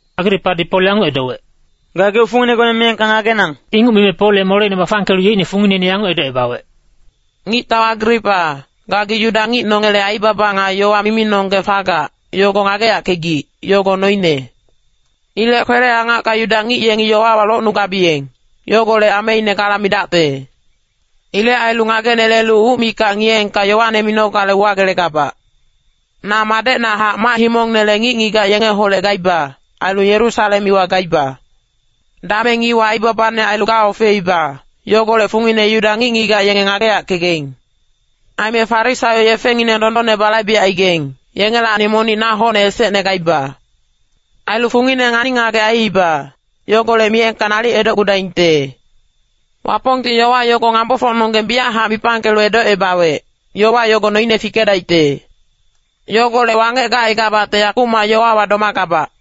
Agripadi Pol yanguc edowec, “Gageuc funginegone miyengka ngagenang.” Inguc mime Pol ye moleine bafangkelu yeicne fungineine yanguc edocebawec, “Ngictau Agripa, gagi Yuda ngic nongele aibaba nga yowa miminonggeng fagac, yogo ngageyackegic, yogo noine. Ilec kwele-angacka Yuda ngic yengi yowawa locnugabiyeng, yogolec ameine gala midacte. Ilec ailu ngagenelelu uc mikac ngiyeengka yowane minogale uwagelegabac. “Na madecnahac mac-himongnele ngic-ngigac yengeholec gaiba, ailu Yerusalem iwa gaiba. Dameng iwa aibabane ailu gaofeiba, yogolec fungine Yuda ngic-ngigac yenge ngageyackegaing. Aime Farisaio yefengineng dondonne balaibecaigaing, yengelacni monic na hocne esecne gaiba. Ailu fungine ngani-ngagec aiiba, yogolec miyengka nalic edocgudaingte. Wapongti yowa yogo ngambofocnonggeng biyachac mipangkelu edocebawec, ‘Yowa yogo noine fikedaicte.’ Yogolec wangec gacaigabacte yakumac yowawa domagabac.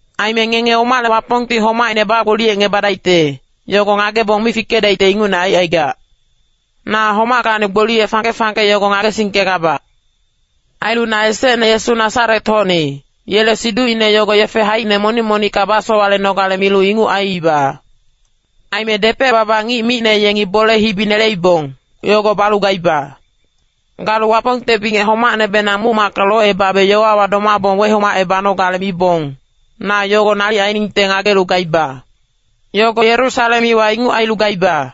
Aime ngenge omale Wapongti homaicne bagboliyecebadaicte, yogo ngagebong mi fikedaicte ingucne aicaigac. Na homackacni gboliye fangke-fangke yogo ngagesingkegabac. “Ailu na esecne Yesu Nasaret-hocni, yele siducine yogo yefe haicine monic-monicka basowalenogale milu inguc aiiba. Aime depec-baba ngic micne yengi bole-hibi neleibong, yogo balu gaiba. Galu Wapongte bingec homacnebenang muc-macka locebabe yowawa domabong wehomacebanogale mibong, na yogo nalic ainingte ngagelu gaiba. Yogo Yerusalem iwa inguc ailu gaiba.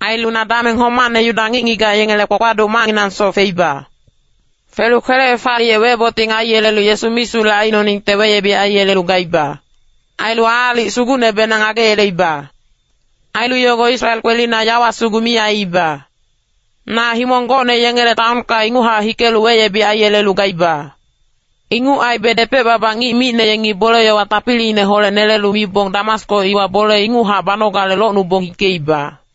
Ailu na dameng homacne Yuda ngic-ngigac yengele kpakpaduc macnginangsoc feiba. Felu kwele-hefaliyec weboting aiyelelu Yesu misulec aicnoningte weyebic aiyelelu gaiba. Ailu aalic sugucnebenang ngageyeleiba. Ailu yogo Israel kwelina yawa sugu mi aiiba. Na himong gocne yengele taonka inguchac hikelu weyebic aiyelelu gaiba. “Inguc aibe depec-baba ngic micne yengi bole-yowa tapiliineholec nelelu mibong Damasko iwa bole inguchac banogale locnubong hikeiba.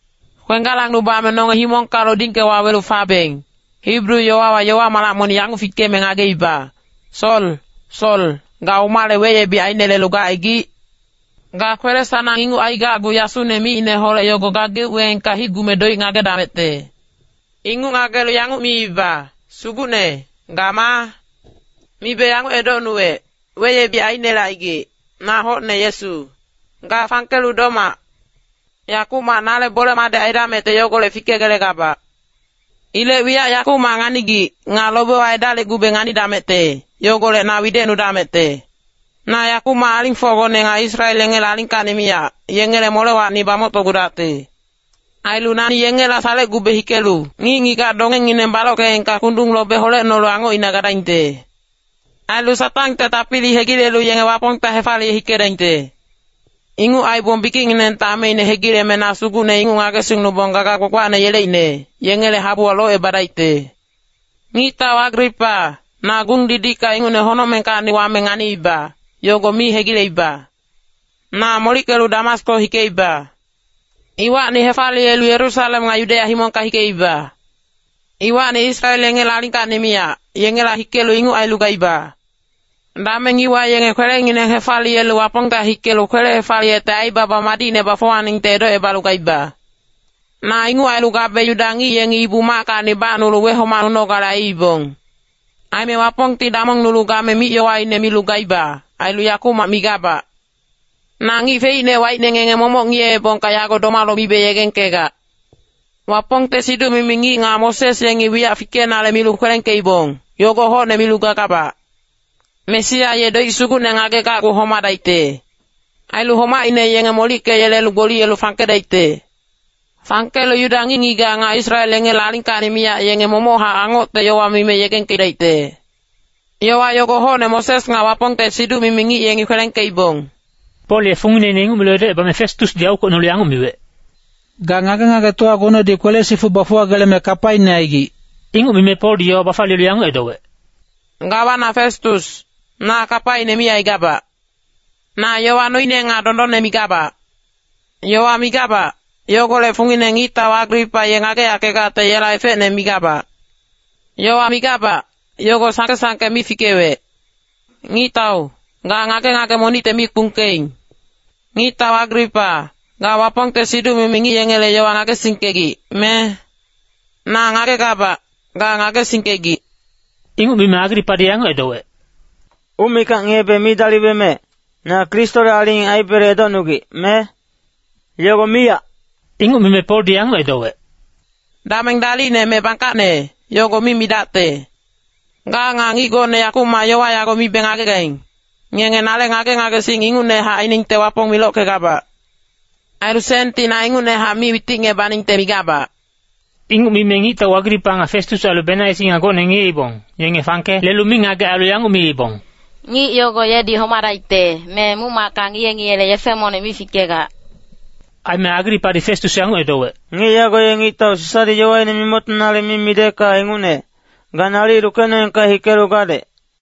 Kwenggalangnubame nonge himongka lodingke wawelu fabeng, Hibru yowawa yowa malac monic yanguc fikeme ngageiba, ‘Sol, Sol, ga omale weyebic ainelelu gacaigic? Ga kwele-sanang inguc aigacgu yasune micineholec yogo gageuc weengka hicgume doic ngagedamecte.’ “Inguc ngagelu yanguc miiba, ‘Sugucne, ga maa?’ “Mibe yanguc edocnuwec, ‘Weyebic ainelecaigic, na hocne Yesu. Ga fangkelu domac. Yakumac nale bole-madec aidamecte yogolec fikegelegabac. Ilec wiyac yakumac nganigic, nga lobewa edalicgube nganidamecte, yogolec na widecnudamecte. Na yakumac alingfocgone nga Israel yengele alingkacni miyac, yengele molewacni bamoctocgudacte. Ailu nani yengela salecgube hikelu ngic-ngigac dongengineng balockeengka kundung lobe holecnolu angocina gadaingte. Ailu Satangte tapili hegilelu yenge Wapongta hefaliye hikedaingte. Inguc aibong bikicnginengte ameine hegileme na Sugucne inguc ngagesingnubong gaga gbagbacne yeleicne, yengele habuwa locebadaicte.’ “Ngictau Agripa, na gung-didicka ingucne honocmengkacni wame nganiiba, yogo mi hegileiba. Na molickelu Damasko hikeiba. Iwacni hefaliyelu Yerusalem nga Yudeya himongka hikeiba. Iwacni Israel yengele alingkacni miyac, yengela hikelu inguc ailu gaiba. Dameng iwa yenge kwelengineng hefaliyelu Wapongta hikelu kwele-hefaliyecte aibaba madicne bafuwaningte edocebalu gaiba. “Na inguc ailu gabe Yuda ngic yengi Ibu-mackacni bacnulu wehomacnunogale aiibong. Aime Wapongti damongnulu game mic-yowaine milu gaiba, ailu yakumac migabac. Na ngic feicne waicne ngenge momoc ngiyeebongka yago domalu mibe yegengkegac. Wapongte siduc-mimi ngic nga Moses yengi wiyac fikenale milu kwelengkeibong, yogo hocne milu gagabac. Mesia ye doic sugucne ngagegacgu homadaicte. Ailu homaicne yenge molickeyelelu gboliyelu fangkedaicte. Fangkelu Yuda ngic-ngigac nga Israel yengele alingkacni miyac yenge momochac angocte yowa mime yegengkedaicte. Yowa yogo hocne Moses nga Wapongte siduc-mimi ngic yengi kwelengkeibong.” Pol ye fungineine inguc milu edocebame Festusdi aukwecnolu yanguc miwec, “Ga ngage-ngagetowagonedi kwele-sifuc bafuwageleme kapaine aigic.” Inguc mime Poldi yowa bafaliyelu yanguc edowec, “Gawana Festus, na kapaine mi aigabac. Na yowa noine nga dondonne migabac. Yowa migabac, yogolec fungine ngictau Agripa ye ngageyackegacte yela efecne migabac. Yowa migabac, yogo sangke-sangke mi fikewec. Ngictau, ga ngage-ngage monicte mi kpungkeing. Ngictau Agripa, ga Wapongte siduc-mimi ngic yengele yowa ngagesingkegic, me? Na ngagegabac, ga ngagesingkegic.” Inguc mime Agripadi yanguc edowec, “Uc mikac ngiyebe mi daliweme, na Kristole aling aibele edocnugic, me? Yogo miyac.” Inguc mime Poldi yanguc edowec, “Dameng dalicne me bangkacne, yogo mi midacte. Ga nga ngic gocne yakumac yowa yago mibe ngagegaing, ngenge nale ngage-ngagesing ingucnehac ainingte Wapong milockegabac. Ailu senti na ingucnehac mi witicngebaningte migabac.” Inguc mime ngictau Agripa nga Festus ailu Benaisi nga gocne ngiyeibong, yenge fangke lelu mingagec ailu yanguc miibong, “Ngic yogo yedi homadaicte, me muc-macka ngiye-ngiyele yefe monic mi fikegac.” Aime Agripadi Festus yanguc edowec, “Ngic yago ye ngictau Sisadi yowaine mimoctonale mi midecka ingucne, ga nalic lukecnoengka hikelu gadec.”